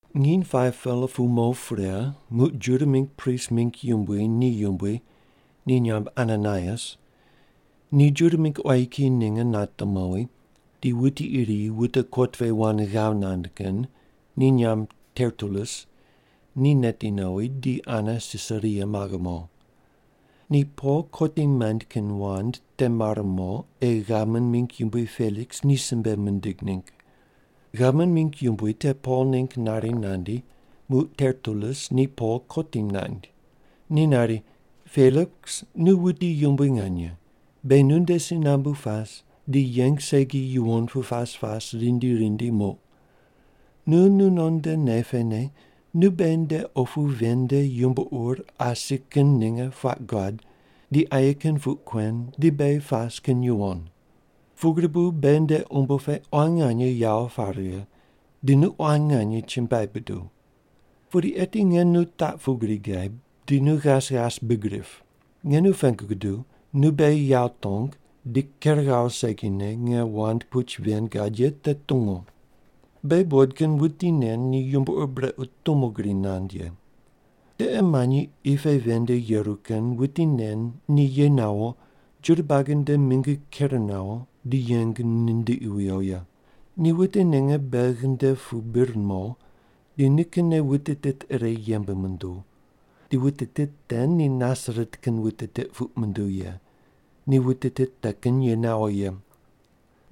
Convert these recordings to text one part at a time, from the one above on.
Nginy 5-pela pu mo pre muq Juda mingg prist mingg yumbui ni yumbui, ni nyamb Ananaias, ni Juda mingg quayi kiyi ninge nate mowi, di wuti iri wute kot pe wand ghav nand kin, ni nyamb Tertulus, ni neti nowi di ane Sisaria maghe mo. Ni Pol kotim maind kin wand te mare mo ei gavman mingg yumbui Peliks ni simbe mindig ningg. Gavman mingg yumbui te Pol ningg nari nandi, muq Tertulus ni Pol kotim naind. Ni nari, “Peliks nu wuti yumbui nganye, beghi nunde si nambu pas di yeng segi yuwon pu pas pas rindi rindi muq. Nu nunon nde nei pene nu beghi nde opu ven nde yumbo ur asi kin ninge puaq guad di aye kin puq kuen di beghi pas kin yuwon. Pugri bu beghi nde umbo pe quan nganye yawo pare righe, di nu quan nganye chumbuai buduw. Pudi eti nge nu taq pugri gaib, di nu ghas ghas big rip. Nge nu pengu guduw, nu beghi yawo tong di ker ghawo segine nge wand puch ven gad ye te tungu. “Beghi buqod kin wuti nen ni yumbo ur brequ tumo gri nand ye. Tiqe manyi qi pe ven nde yeru kin wuti nen ni ye nawo Juda buagi nde mingi ker nawo di yeng nindiqi wiyo ye. Ni wute ninge beghi nde pu bir mo di nikinne wute tit ire yembe munduw, di wute tit te ni Nasaret kin wute tit puq munduw ye, ni wute tit te kin ye nawo ye.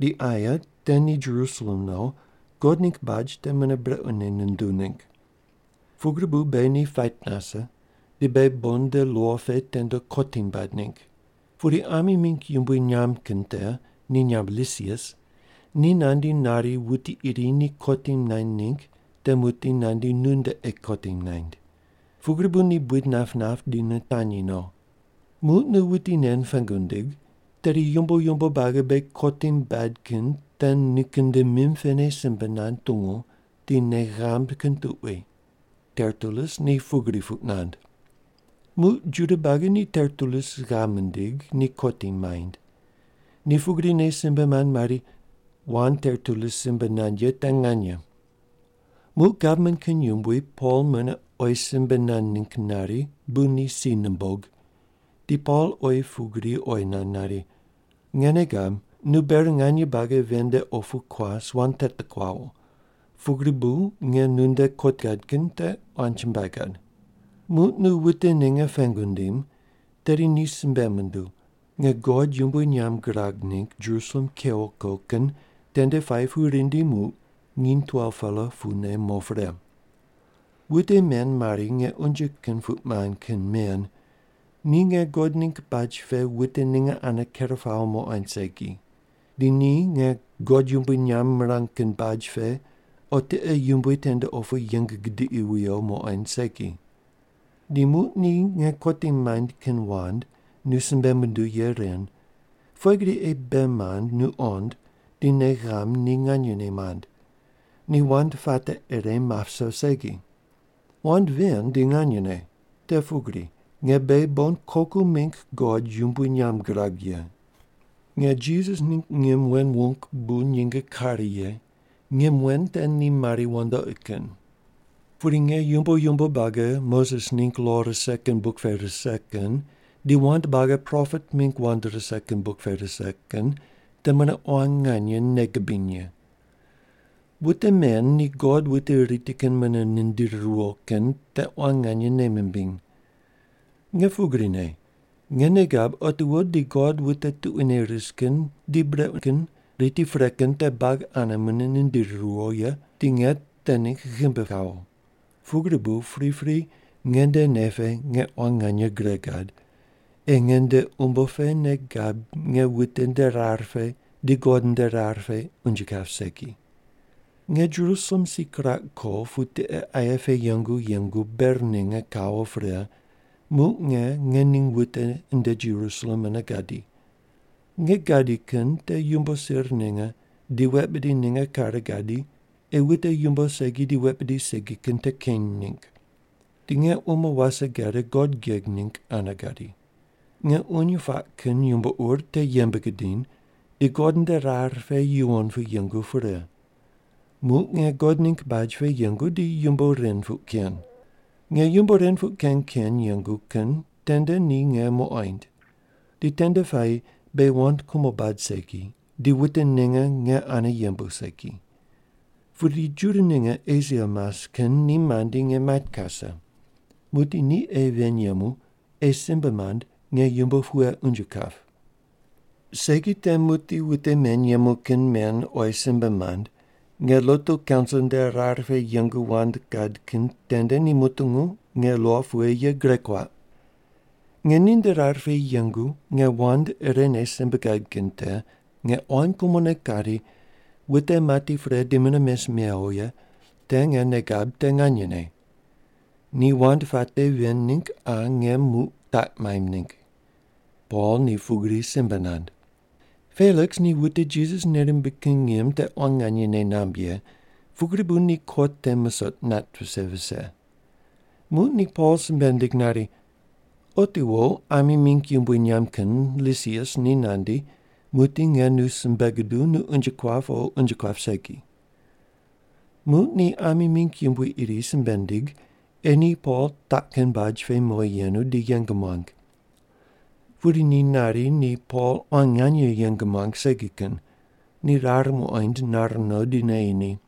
Di aye te ni Jerusalem no God ningg baj te mune brequne nunduw ningg. Pugri bu beghi ni pait nase, di beghi bon nde lo pe tende kotim baid ningg. Pudi ami mingg yumbui nyamb kin te ni nyamb Lisias, ni nandi nari wuti iri ni kotim naind ningg te muqdi nandi nunde ei kotim naind. Pugri bu ni buid nap nap di nitanyi no. Muq nu wuti nen pengu ndig, tedi yumbo yumbo buagi beghi kotim baid kin te nikin nde mim pene simbe nand tungu di nei ghamb kin tuqui.” Tertulus ni pugri puq nand. Muq Juda buagi ni Tertulus ghav mindig, ni kotim maind. Ni pugrine simbe mand mari, “Wand Tertulus simbe nand ye te nganye.” Muq gavman kin yumbui Pol mune oyi simbe nand ningg nari bu ni si numbog, di Pol oyi pugri oyi nand nari, “Nge nei gab, nu ber nganye buagi ven nde opu kuas wand teti kuawo, pugri bu nge nunde kot gad kin te quan nganye chumbuai gad. Muq nu wute ninge pengu ndim, tedi ni simbe munduw, nge God yumbui nyamb girag ningg Jerusalem kewo ko kin tende puayi pu rindi muq nginy 12-pela pune mo pre. Wute men mari nge unje kin puq mand kin men ni nge God ningg baj pe wute ninge ane ker pawo muqoind segi, di ni nge God yumbui nyamb mirang kin baj pe o tiqe yumbui tende opu yeng gidiqi wuyo muqoind segi. Di muq ni nge kotim maind kin wand nu simbe munduw ye ren, pughe gri ei bei mand nu qond di nei ghamb ni nganyene mand. Ni wand puate ire map viso segi. “Wand ven di nganyene. Te pugri: Nge beghi bon koku mingg God yumbui nyamb girag ye. Nge Jisas ningg ngim wen wung bu nyinge kare ye, ngim wen te ni mari wandoqi kin. Pudi nge yumbo yumbo buagi Moses ningg lo rise kin buk pe rise kin di wand buagi propet mingg wand rise kin buk pe rise kin te mune quan nganye nei gibiny ye. Wute men ni God wute riti kin munene nindiri riwo kin te quan nganye nei mimbiny. Nge pugrine, nge nei gab otiwo di God wute tuquine ris kin di brequ kin riti pre kin te buagi ane mune nindiri riwo ye, di nge te ningg ghimbi kawo. Pugri bu pripri nge nde nei pe nge quan nganye gre gad ei nge nde umbo pe nei gab nge wute nde rar pe di God nde rar pe unje kap segi. “Nge Jerusalem si kiraq ko pu tiqe aye pe yengu yengu ber ninge kawo pre muq nge nge ningg wute nde Jerusalem mune gadi. Nge gadi kin te yumbo sir ninge di wet bidi ninge kare gadi ei wute yumbo segi di wet bidi segi kin te keny ningg. Di nge umo wase gade God geg ningg ane gadi. Nge uny puaq kin yumbo ur te yembe gidiny di God nde rar pe yuwon pu yengu pre, muq nge God ningg baj pe yengu di yumbo ren puq ken. Nge yumbo ren puq ken ken yengu kin tende ni nge muqoind. Di tende puayi beghi wand kumo bad segi, di wute ninge nge ane yembu segi. Pudi Juda ninge Esia mas kin ni mandi nge mait kase. Muqdi ni ei ven yemu ei simbe mand nge yumbo pughe unje kap. Segi te muqdi wute men yemu kin men oyi simbe mand, nge lotu kaunsil nde rar pe yengu wand gad kin tende ni mutungu nge lo pughe ye gure kuaq. Nge ninde rar pe yengu nge wand irene simbe gad kin te, nge quan kumone kari, ‘Wute mati pre di mune mes mewo ye te nge nei gab te nganyene. Ni wand puate ven ningg qa nge muq taq maimb ningg’.” Pol ni pugri simbe nand. Peliks ni wute Jisas nei rimbig kin ngim te quan nganye nei namb ye, pugri bu ni kot te musoq nat vise vise. Muq ni Pol simbe nindig nari, “Otiwo ami mingg yumbui nyamb kin Lisias ni nandi, muqdi nge nu simbe guduw nu unje kuap o unje kuap segi.” Muq ni ami mingg yumbui iri simbe nindig ei ni Pol taq kin baj pe mowi yenu di yeng muang. Pudi ni nari ni Pol quan nganye yeng muang segi kin, ni rar muqoind nar no di neyi ni.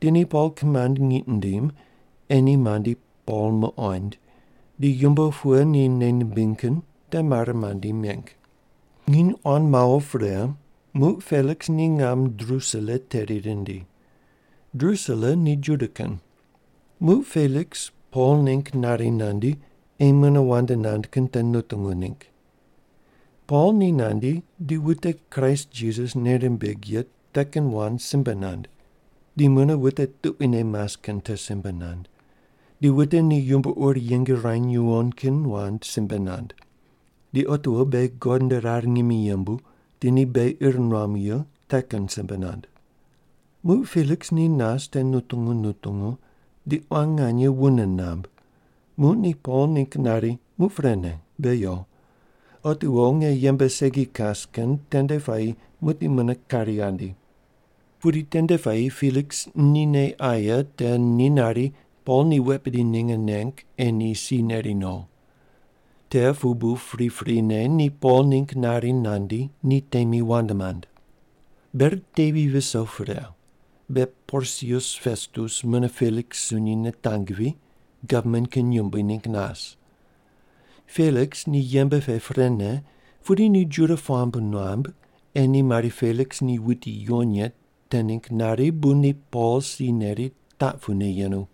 Di ni Pol kimand ngiq mindim ei ni mandi Pol muqoind, di yumbo pughe ni nei nimbiny kin te mare mandi meng. Nginy quan mawo pre, muq Peliks ni ngam Drusila teri rindi. Drusila ni Juda kin. Muq Peliks Pol ningg nari nandi ei mune wand nand kin te nutungu ningg. Pol ni nandi di wute Kraist Jisas nei rimbig ye te kin wand simbe nand. Di mune wute tuquine mas kin te simbe nand, di wute ni yumbo ur yeng ruany yuwon kin wand simbe nand, di otiwo beghi God nde rar ngimi yembu di ni beghi ir nuamu ye te kin simbe nand. Muq Peliks ni nas te nutungu nutungu di quan nganye wune namb, muq ni Pol ningg nari, “Muq prene, be yo. Otiwo nge yembe segi kas kin tende puayi muqdi mune kari ghandi.” Pudi tende puayi Peliks ni nei aye te ni nari Pol ni wet bidi ninge neng ei ni si neri no. Te pu bu priprine ni Pol ningg nari nandi ni temi wand mand. Ber tevi viso pre, be Porsius Pestus mune Peliks sunyi nitangvi, gavman kin yumbui ningg nas. Peliks ni yembe pe prene pudi ni Juda puamb nuam ei ni mari Peliks ni wuti yuwon ye te ningg nari bu ni Pol si neri taq pune yenu.